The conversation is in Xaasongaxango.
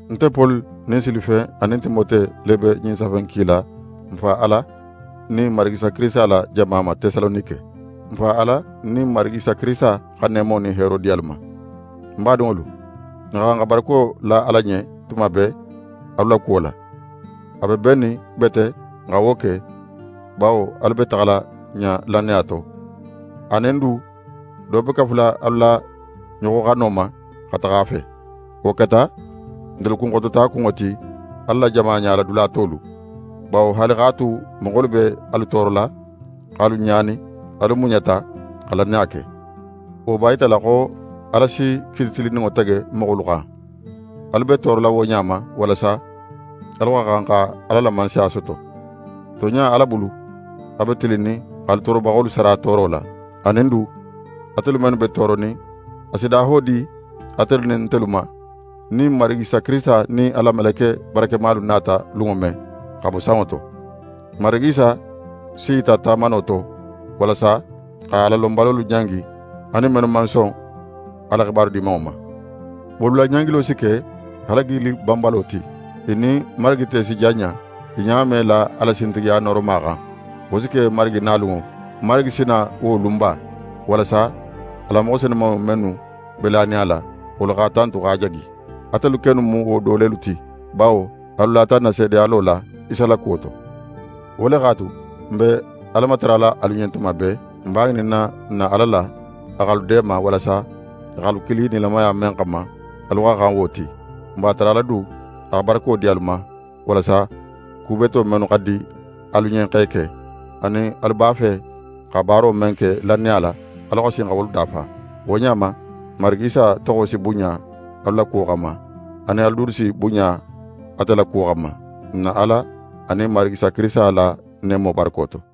Nte Poli nin Silifen anin Timote le be ɲin safe in kila n Fa Ala nin Marigi Isa Kirisita la jama ma Tesalonike. N Fa Ala nin Marigi Isa Kirisita xa neemo nin heero di alu ma. N badinŋolu, n xa xan xa barako la Ala ɲen tuma bee, alu la kuwo la. A be bennin bete n xa wo ke, bawo alu be taxala ɲa lannaya to, anin du do be kafula alu la ɲoxoxano ma xa taxa a fe. Wo keta ntelu kunxotota kunŋo ti Ala la jama ɲala dula tolu, bawo haali x'a tu moxolu be alu toorola, x'alu ɲaani, alu muɲata xa lannaya ke. Wo b'a yitala xo Ala si kiiti tilinninŋo tege moxolu xan. Alu be toorola wo ɲa ma, walasa alu xa xan Ala la Mansaya soto ti. Tonɲa, Ala bulu, a be tilinnin x'alu toorobaxolu sara tooro la. Anin du, atelu mennu be tooronin, a si daho di atelu nin ntelu ma, nin Marigi Isa nin a la meleke barakemalu nata lunŋo men xa bo sanŋo to. N Marigi Isa s'i yita tamano to, walasa xa Alalonbalolu ɲangi anin mennu man son a la xibaru Dimanŋo ma. Wolu la ɲangilo si ke halagili banbalo ti. I nin Marigi te si janɲa; i ɲa me la a la sintigiya nooroma xan. Wo si ke Marigi nalunŋo. Marigi si na wo lunba, walasa a la moxo senumanŋolu mennu be lanin a la, wolu x'a tantu x'a jagi. Atelu kennu mu wolu do lelu ti, bawo alu lata n na seedeyalo la Isa la kuwo to. Wo le x'a tu, n be Ala matarala alu ɲen tuma bee. N b'a ŋininna n na Ala la, a x'alu deema, walasa a x'alu kili nilamaya men xanma, alu xa xan wo ti. N b'a tarala du a xa barako di alu ma, walasa ku beto mennu xa di alu ɲen x'e ke, anin alu b'a fe xa baaro men ke lannaya la, alu xa sin xa wolu dafa. Wo ɲa ma, n Marigi Isa toxo si bunɲa alu la kuwo xanma, anin alu dulu si bunɲa ate la kuwo xanma, n na Ala anin Marigi Isa Kirisita la neemo barako to.